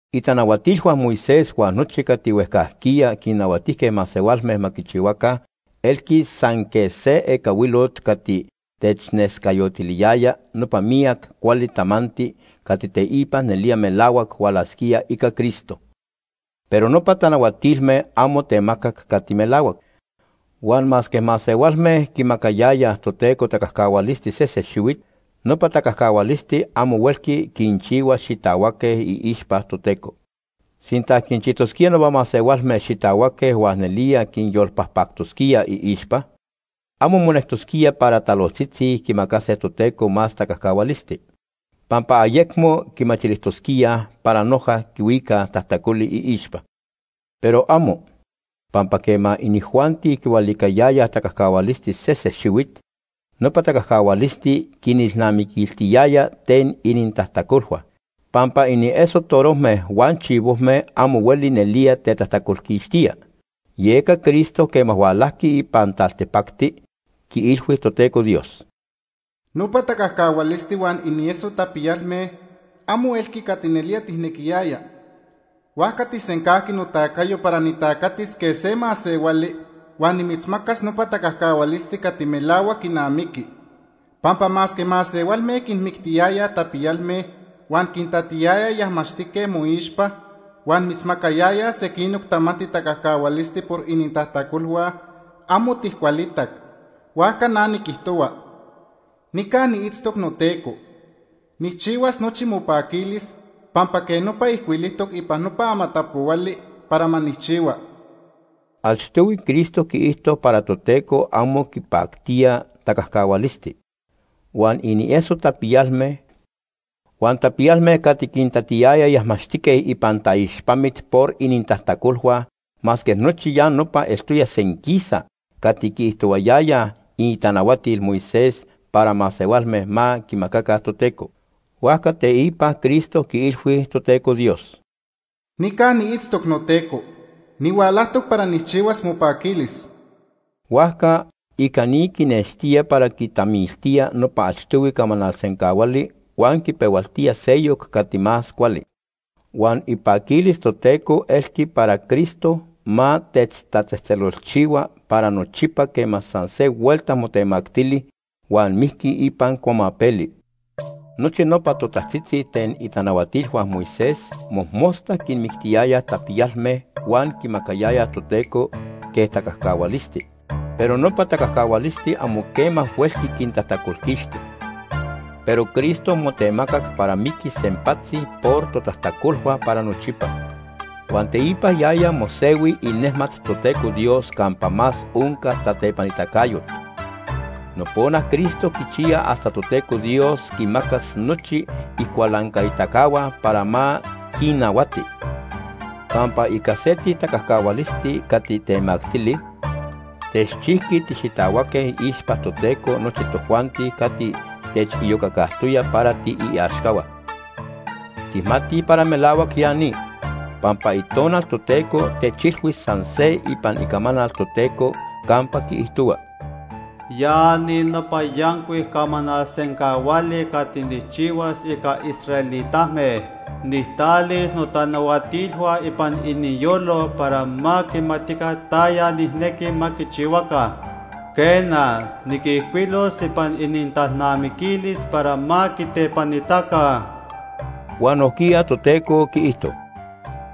Itanahuatilhua Moisés huan nochi cati huejcajquiya quinnahuatijque masehualme ma quichihuaca elqui san quej se ecahuilot cati technescayotiliyaya nopa miyac cuali tamanti cati teipa nelía melahuac hualasquía ica Cristo. Pero nopa tanahuatilme amo temacac cati melahuac. Huan masque masehualme quimacayayaj Toteco tacajcahualisti sese xihuit, nopa tacajcahualisti amo huelqui quinchihua xitahuaque iixpa Toteco. Sinta quinchijtosquía nopa masehualme xitahuaque huan nelía quinyolpajpactosquía iixpa, amo monectosquía para talojtzitzi quimacase Toteco más tacajcahualisti, pampa ayecmo quimachilijtosquíaj para noja quihuicaj tajtacoli iixpa. ¡Pero amo! Pampa quema inijuanti quihualicayayaj tacajcahualisti sese xihuit, nopa tacajcahualisti quinnelnamiquiltiyaya ten inintajtacolhua. Pampa inieso torojme huan chivojme amo hueli nelía tetajtacolquixtía. Yeca Cristo, quema hualajqui ipan taltipacti, quiilhui Toteco Dios: “Nopa tacajcahualisti huan inieso tapiyalme amo elqui cati nelía tijnequiyaya, huajca tijsencajqui notacayo para nitacatis quej se masehuali huan nimitzmacas nopa tacajcahualisti cati melahuac quinamiqui. Pampa masque masehualme quinmictiyayaj tapiyalme huan quintatiyayaj yajmaxtique moixpa, huan mitzmacayayaj sequinoc tamanti tacajcahualisti por inintajtacolhua, amo tijcualitac. Huajca na niquijtohua: ‘Nica niitztoc noTeco. Nijchihuas nochi mopaquilis pampa quej nopa ijcuilijtoc ipan nopa Amatapohuali para ma nijchihua.’” Achtohui Cristo quiijto para Toteco amo quipactía tacajcahualisti, huan inieso tapiyalme, huan tapiyalme cati quintatiyayaj yajmaxtique ipan taixpamit por inintajtacolhua masque nochi ya nopa eltoya senquisa cati quiijtohuayayaj itanahuatil Moisés para masehualme ma quimacaca Toteco. Huajca teipa Cristo quiilhui Toteco Dios: “Nica niitztoc noTeco. Nihualajtoc para nijchihuas mopaquilis.” Huajca ica ni quinextía para quitamiltía nopa achtohui camanal sencahuali huan quipehualtía seyoc cati más cuali. Huan ipaquilis Toteco elqui para Cristo ma techtatzejtzelolchihua para nochipa quema san se huelta motemactili huan mijqui ipan cuamapeli. Nochi nopa totajtzitzi ten itanahuatijcahua Moisés mojmosta quinmictiyayaj tapiyalme huan quimacayayaj Toteco quej tacajcahualisti. Pero nopa tacajcahualisti amo quema huelqui quintajtacolquixti. Pero Cristo motemacac para miquis sempatzi por totajtacolhua para nochipa, huan teipa yaya mosehui inejmat Toteco Dios campa más onca tatepanitacayot. Nopona Cristo quichiya hasta Toteco Dios quimacas nochi icualancaitacahua para ma quinnahuati. Pampa ica setzi tacajcahualisti cati temactili, techchijqui tixitahuaque iixpa Toteco nochi tojuanti cati techiyocacajtoya para tiiaxcahua. Tijmatij para melahuac ya ni, pampa Itonal Toteco techilhui san se ipan Icamanal Toteco campa quiijtohua: “Ya ni nopa yancuic camanal sencahuali cati nijchihuas ica israelitame. Nijtalis notanahuatilhua ipan iniyolo para ma quimatica taya nijnequi ma quichihuaca. Quena, niquijcuilos ipan inintalnamiquilis para ma quitepanitaca.” Huan nojquiya Toteco quiijto: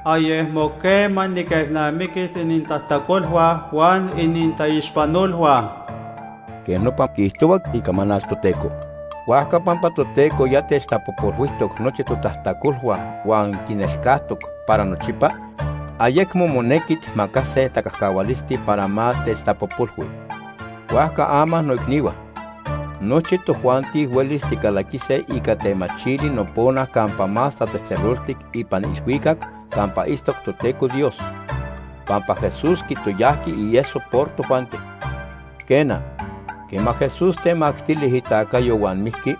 “Ayecmo quema niquelnamiquis inintajtacolhua huan inintaixpanolhua.” Quej nopa quiijtohua Icamanal Toteco. Huajca pampa Toteco ya techtapojpolhuijtoc nochi totajtacolhua huan quinelcajtoc para nochipa, ayecmo monequi tijmacase tacajcahualisti para ma techtapojpolhui. Huajca ama noicnihua, nochi tojuanti huelis ticalaquise ica temachili nopona Campa Más Tatzejtzeloltic ipan ilhuicac campa itztoc Toteco Dios, pampa Jesús quitoyajqui ieso por tojuanti. Quena, quema Jesús temactili itacayo huan mijqui,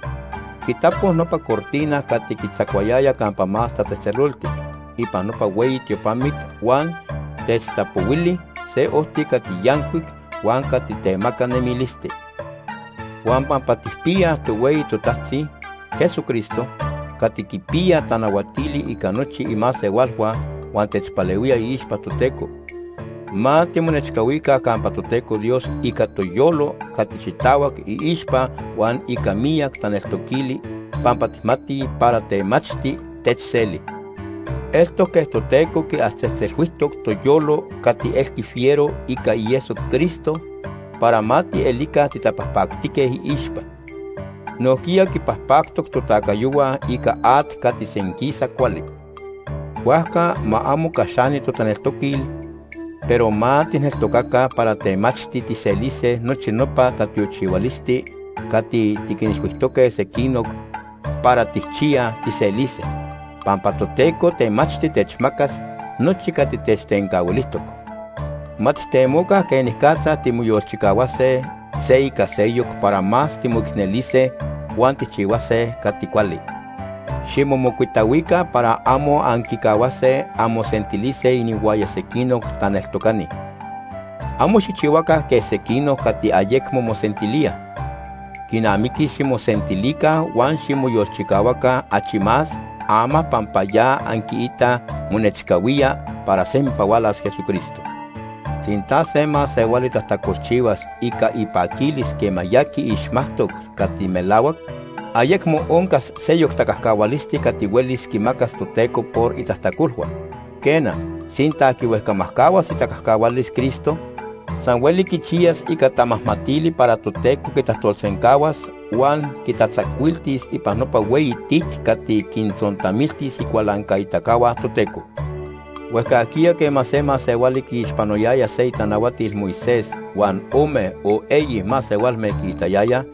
quitapo nopa cortina cati quitzacuayaya Campa Más Tatzejtzeloltic ipan nopa hueyi tiopamit huan techtapohuili se ojti cati yancuic huan cati temaca nemilisti. Huan pampa tijpiyaj tohueyi totajtzi, Jesucristo, cati quipiya tanahuatili ica nochi imasehualhua huan techpalehuía iixpa Toteco, ma timonechcahuica campa Toteco Dios ica toyolo cati xitahuac iixpa huan ica miyac taneltoquili pampa tijmatij para temachti techseli. Eltoc quej Toteco quiatzejtzelhuijtoc toyolo cati elqui fiero ica ieso Cristo para ma tielica titapajpactique iixpa. Nojquiya quipajpactoc totacayohua ica at cati senquisa cuali. Huajca ma amo caxani totaneltoquil, pero ma tijneltocaca para temachti tijselise nochi nopa tatiochihualisti cati tiquinilhuijtoque sequinoc para tijchiyaj tijselise, pampa Toteco temachti techmacas nochi cati techtencahuilijtoc. Ma tijtemoca quenicatza timoyolchicahuase se ica seyoc para más timoicnelise huan tijchihuase cati cuali. Ximomocuitahuica para amo anquicahuase anmosentilise inihuaya sequinoc taneltocani. Amo xijchihuaca quej sequinoc cati ayecmo mosentilíaj. Quinamiqui ximosentilica huan ximoyolchicahuaca achi más ama pampa ya anquiitaj monechcahuía para sempa hualas Jesucristo. Sinta se masehuali tajtacolchihuas ica ipaquilis quema ya quiixmajtoc cati melahuac, ayecmo oncas seyoc tacajcahualisti cati huelis quimacas Toteco por itajtacolhua. Quena, sinta quihuejcamajcahuas itacajcahualis Cristo, san hueli quichiyas ica tamajmatili para Toteco quitajtolsencahuas huan quitatzacuiltis ipan nopa hueyi tit cati quintzontamiltis icualancaitacahua Toteco. Huejcajquiya quema se masehuali quiixpanoyaya se itanahuatil Moisés huan ome o eyi masehualme quiitayayaj,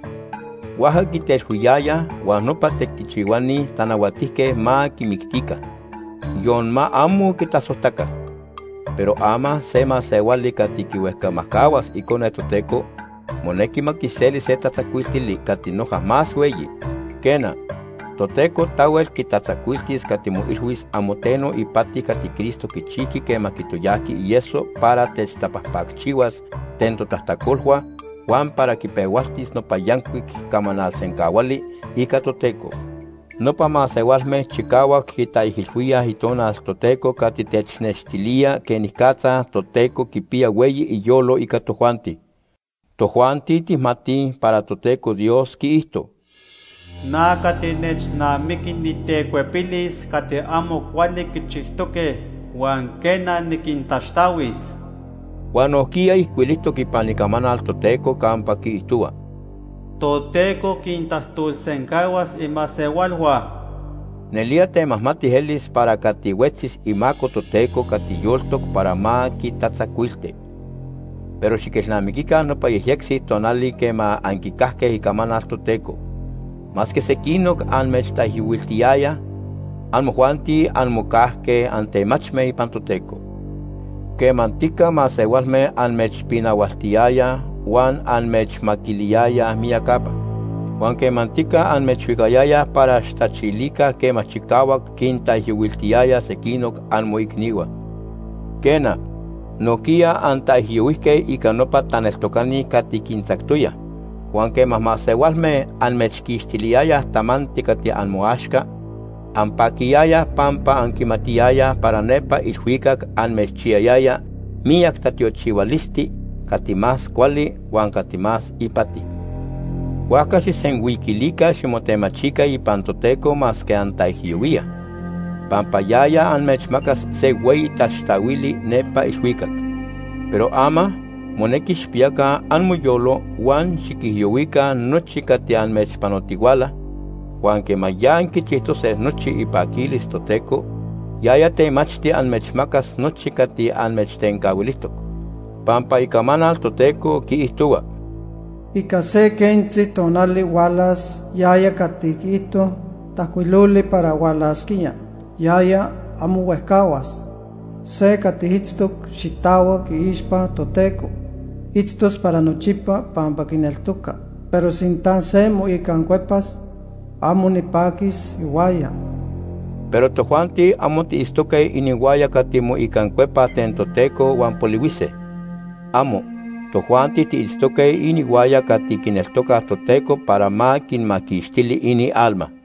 huajca quitelhuiyayaj huan nopa tequichihuani tanahuatijque ma quimictica, yon ma amo quitasojtaca. Pero ama se masehuali cati quihuejcamajcahuas Icone Toteco, monequi ma quiseli se tatzacuiltili cati noja más hueyi. Quena, Toteco tahuel quitatzacuiltis cati moilhuis amo teno ipati cati Cristo quichijqui quema quitoyajqui ieso para techtapajpacchihuas ten totajtacolhua huan para quipehualtis nopa yancuic camanal sencahuali ica Toteco. Nopa masehualme chicahuac quitaijilhuíaj Itonal Toteco cati technextilía quenicatza Toteco quipiya hueyi iyolo ica tojuanti. Tojuanti tijmatij para Toteco Dios quiijto: “Na cati nechnamiqui nitecuepilis cati amo cuali quichijtoque huan quena, niquintaxtahuis.” Huan nojquiya ijcuilijtoc ipan Icamanal Toteco campa quiijtohua: “Toteco quintajtolsencahuas imasehualhua.” ¡Nelía temajmati elis para cati huetzis imaco Toteco cati yoltoc para ma quitatzacuilti! Pero xiquelnamiquica nopa yejyectzi tonali quema anquicajque icamanal Toteco. Masque sequinoc amechtaijyohuiltiyayaj, amojuanti anmocajque antemachme ipan Toteco. Quemantica masehualme amechpinahualtiyayaj huan amechmaquiliyayaj miyacapa. Huan quemantica amechhuicayayaj para xijtachilica quema chicahuac quintaijyohuiltiyayaj sequinoc amoicnihua. Quena, nojquiya antaijyohuijque ica nopa taneltocani cati quintzactoyaj. Huan quema masehualme amechquixtiliyayaj tamanti cati amoaxca, anpaquiyayaj pampa anquimatiyayaj para nepa ilhuicac amechchiyayaya miyac tatiochihualisti cati más cuali huan cati más ipati. Huajca xijsenhuiquilica ximotemachica ipan Toteco masque antaijyohuíaj, pampa yaya amechmacas se hueyi taxtahuili nepa ilhuicac. Pero ama, monequi xijpiyaca amoyolo huan xiquijyohuica nochi cati amechpanotihuala, huan quema ya anquichijtose nochi ipaquilis Toteco, yaya temachti amechmacas nochi cati amechtencahuilijtoc. Pampa Icamanal Toteco quiijtohua: “Ica se quentzi tonali hualas yaya cati quiijto tajcuiloli para hualasquía. Yaya, amo huejcahuas. Se cati itztoc xitahuac iixpa Toteco, itztos para nochipa pampa quineltoca. Pero sinta se moicancuepas, amo nipaquis ihuaya.” Pero tojuanti amo tiitztoque inihuaya cati moicancuepaj ten Toteco huan polihuise. ¡Amo! Tojuanti tiitztoque inihuaya cati quineltocaj Toteco para ma quinmaquixtili inialma.